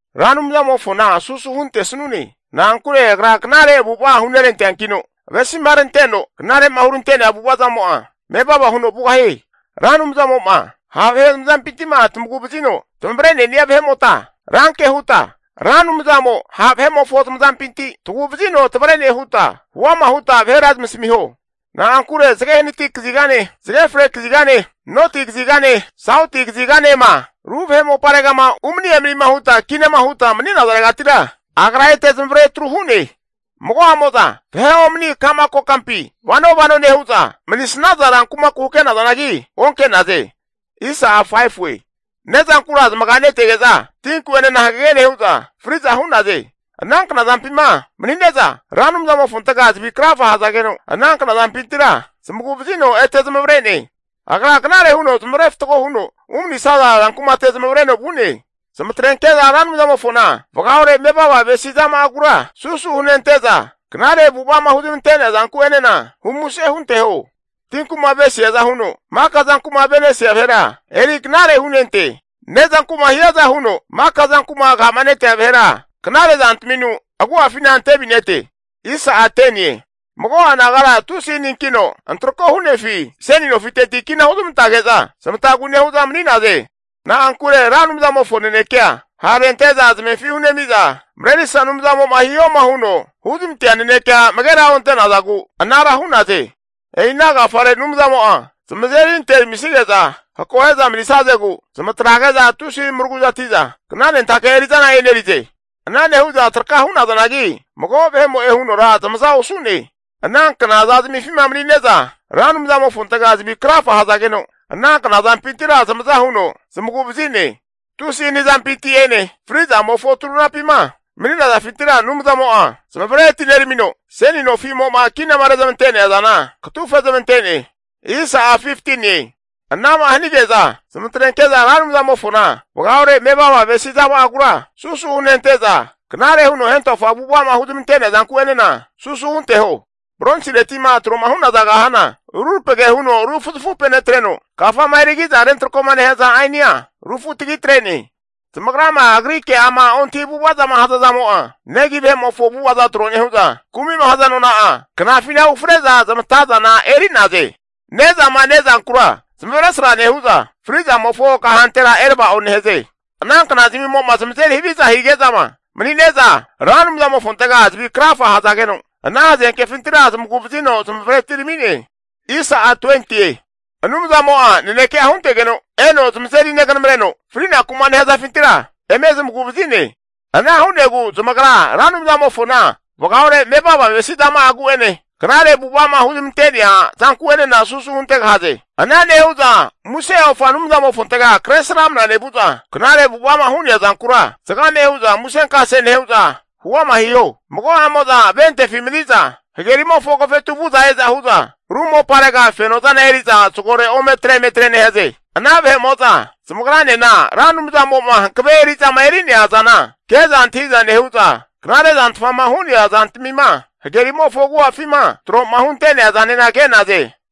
Ra Anumzamofona susu huntesnune. Na'ankure agra knare avu'ava hu'neranteankino, avesimaranteno knare'ma hunerantea avu'avazamo'a mevava huno vugahie. Ra Anumzamo'ma ha' vahe zamazampinti'ma tamagu'vazino tamavre'nenia vahe'mota, ranke huta Ra Anumzamo ha' vahe'mofo zamazampinti tagu'vazino tavre'ne huta huama huta vahera zamasamiho. Na'ankure zage hanati kazigane, zage fre kazigane, noti kazigane, sauti kaziganema ru vahe moparegama umani emanima huta kinama huta mani'nazaregatira, agra ete zamavare atru hu'ne. Mago'amo'za vahe omani ka'ma kokampi vano vano nehu'za, manisnaza rankumaku hake'nazanagi onke'naze. Ne'zankura zamaganetege'za tinku'enena hagage nehu'za fri'za hu'naze. Ana kna zampima manine'za, Ra Anumzamofontega zavi krafa hazageno, ana kna zampintira zamagu'vazino ete zamavare'ne. Agra knare huno zamavare fatgo huno umanisaza rankumate zamavareno vu'ne. Zamatrenke'za Ra Anumzamofona vagaore mevava avesi zama'agura susu hunente'za, knare avu'ava'ma huzmante'nea zanku'enena humuse hunteho. Tinku'ma avesiaza huno maka zanku'ma ave'nesia vaheran eri knare hunente. Ne'zanku'ma hiaza huno maka zanku'ma aga'ma netea vahera, knare zantaminu agu'afina antevinete. Mago'a nagara tusi haninkino antrako hu'nefi, seni nofiteti kina huzmantage'za zamatagu nehu'za mani'naze. Na'ankure Ra Anumzamofo nanekea ha'arente'za zamefi hunemiza Marerisa Anumzamo'ma hihoma huno huzmantea nanekea amagera onte'nazagu anara hu'naze. E'ina agafare Anumzamo'a zamazeri anteramisige'za akohe'za manisazegu, zamatrege'za tusi maraguzati'za knanentake eri'zana eri'naze. Ana nehu'za traka hu'nazanagi, mago vahe'mo'e hunora zamaza osu'ne. Ana knaza zamifima zamagrama mani'ne'za, Ra Anumzamofontega zavi krafa hazageno, ana knazampintira zamaza huno zamagu'vazi'ne. Tusi hani zampinti'ene fri'zamofo turunapima mani'nazafintira Anumzamo'a zamavare atineramino, seni nofimo'ma kinama rezmante'nea zana katufezmante'ne. Ana'ma hanige'za zamatrenke'za Ra Anumzamofona vagaore mevava avesi zama'agura susu hunente'za, knare huno hentofa avu'ava'ma huzmante'nea zanku'enena susu hunteho. Bronsireti'ma tro hu'naza kahana rurapage huno rufuzafupenetreno, kafama erigi'za rentrako nehaza ainia rufutagi atre'ne. Zamagrama agri ke'ama ontahi avu'ava'ma hazazamo'a, negi vahe'mofo avu'ava'za tro nehu'za, kumi'ma haza nona'a knafina ufre'za zamatazana eri'naze. Ne'zama ne'zankura zamavesra nehu'za, fri'zamofo kahantera erava'o nehaze. Ana knazamo'ma zamazeri haviza hige'zama manine'za, Ra Anumzamofontega zavi krafa hazageno, ana hazenkefintira zamagu'vazino zamavare atirami'ne. Anumzamo'a naneke'a huntegeno eno zamazeri neganamreno, frinaku'ma nehazafintira eme zamagu'vazi'ne. Ana hu'negu zamagra Ra Anumzamofona vagaore mevava avesi zama'agu'ene, knare avu'ava'ma huzmante'nea zanku'enena susu huntegahaze. Ana nehu'za muse ofa Anumzamofontega Kresramana nevu'za, knare avu'ava'ma hu'nea zankura zagame hu'za musenkase nehu'za huama hiho. Mago'amo'za ventefi mani'za hagerimofo agofetu vu'za e'za hu'za ru moparega fenozana eri'za zagore ometre emetre nehaze. Ana vahe'mo'za zamagranena Ra Anumzamo'ma hankave eri'zama eri'nea zana ke'za antahi'za nehu'za, knare zantfama hu'nea zantamima hagerimofo agu'afima tro'ma hunte'nea zanena ke'naze.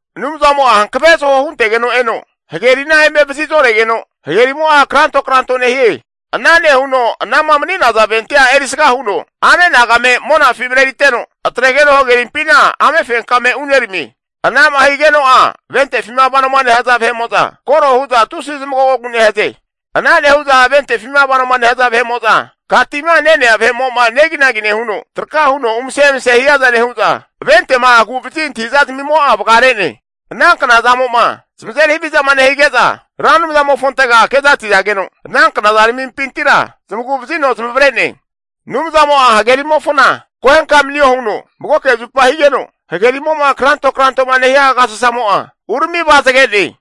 Anumzamo'a hankave zaho huntegeno eno hagerina eme vazi'zoregeno, hagerimo'a kranto kranto nehie. Ana nehuno anama mani'naza ventea erisga huno ame'nagame monafi mareriteno, atregeno hagerimpina amefenkame uneramie. Ana'ma higeno'a ventefima vanoma nehaza vahe'mo'za koro hu'za tusi zamagogogu nehaze. Ana nehu'za ventefima vanoma nehaza vahe'mo'za aka tima ne'nea vahe'mo'ma neginagi nehuno, traka huno umse emase hiaza nehu'za, ventema agu'vazi antahi'zazmimo'a vagare'ne. Ana knazamo'ma zamazeri havizama nehige'za, Ra Anumzamofontega kezati'zageno, ana knaza ramimpintira zamagu'vazino zamavare'ne. Anumzamo'a hagerimofona akohenka manio huno magoke zupa higeno, hagerimo'ma kranto kranto'ma nehia agasasamo'a urami avazage'ne.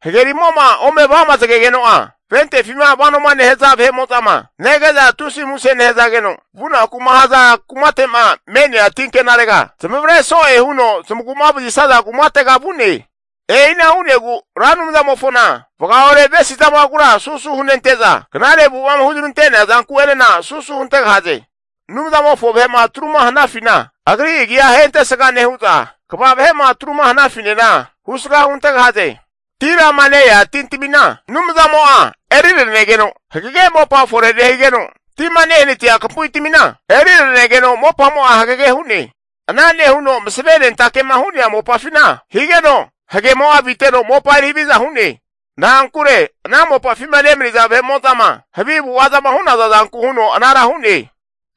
Hagerimo'ma ome avamazagegeno'a ventefima vano nehaza vahe'mo'zama nege'za tusi muse nehazageno, vunaku'ma haza kumate'ma me'nea tinkenarega zamavare so'e huno zamagu'ma vazisaza kumatega vu'ne E'ina hu'negu Ra Anumzamofona vagaore avesi zama'agura susu hunente'za, knare avu'ava'ma huzmante'nea zanku'enena susu huntegahaze. Anumzamofo vahe'ma atruma hanafina Agri agi'a ahentesga nehu'za, kva vahe'ma atruma hanafinena husga huntegahaze. Tirama ne-ea tintamina Anumzamo'a eriranegeno hagege mopa fore nehigeno, tima nehanatia kampuitamina eri ranegeno mopamo'a hagege hu'ne. Ana nehuno masave nentake'ma hu'nea mopafina, higeno hagemo'a aviteno mopa eri haviza hu'ne. Na'ankure ana mopafima nemaniza vahe'mo'zama havi avu'avazama hu'naza zanku huno anara hu'ne.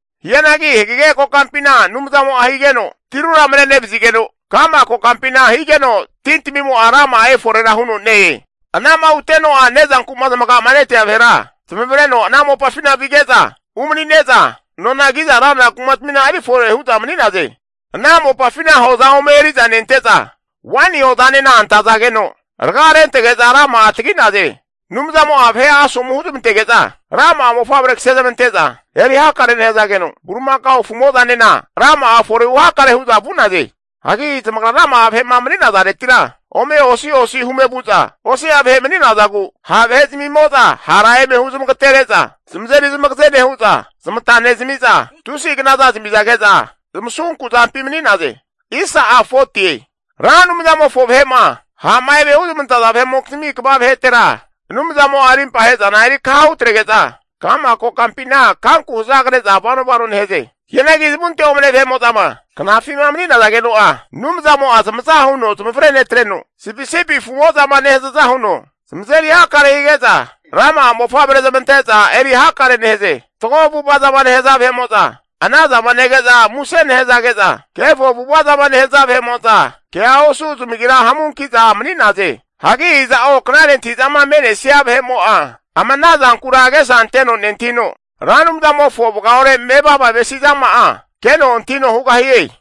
Hianagi hagege kokampina Anumzamo'a higeno tirura mare'nevazigeno, ka'ma kokampina higeno tintamimo'a rama'a eforera huno ne-e. Ana'ma huteno'a ne'zanku'ma zamaga'ma netea vahera zamavareno ana mopafina vige'za umanine'za, nona ki'za ranra kumatmina erifore hu'za mani'naze. Ana mopafina hoza ome eri'za nente'za, waini hozanena antazageno raga rentege'za rama'a tagi'naze. Anumzamo'a vahe'a asomu huzmantege'za rama'a mofavre kasezamante'za eri hakare nehazageno, bulimakao afu'mo'zanena rama'a forehu hakare hu'za vu'naze. Hagi zamagra rama'a vahe'ma mani'nazaretira ome osi osi hume vu'za osi'a vahe mani'nazagu ha' vahe zamimo'za hara eme huzmagatere'za zamazeri zamagaze nehu'za, zamata nezami'za tusi knaza zamizage'za zamasunku zampi mani'naze. Ra Anumzamofo vahe'ma ha'ma eme huzmantaza vahe'mokizmi kva vahetera, Anumzamo'a arimpa ahe'zana erikaha hutrege'za, ka'ma kokampina kanku hazagre'za vano vano nehaze. Hianagi zamunte omane vahe'mo'zama knafima mani'nazageno'a, Anumzamo'a zamaza huno zamavare netreno, sipisipi afu'mo'zama nehazaza huno zamazeri hakare hige'za, rama'a mofavre zamante'za eri hakare nehaze. Fatgo avu'ava'zama nehaza vahe'mo'za ana zama nege'za muse nehanage'za, kefo avu'avazama nehaza vahe'mo'za kea osu zamagira hamunki'za mani'naze. Hagi iza'o knare antahi'zama me'nesia vahe'mo'a ama ana zankura agesa anteno nentahino, Ra Anumzamofo vagaore mevava avesi zama'a keno antahino hugahie.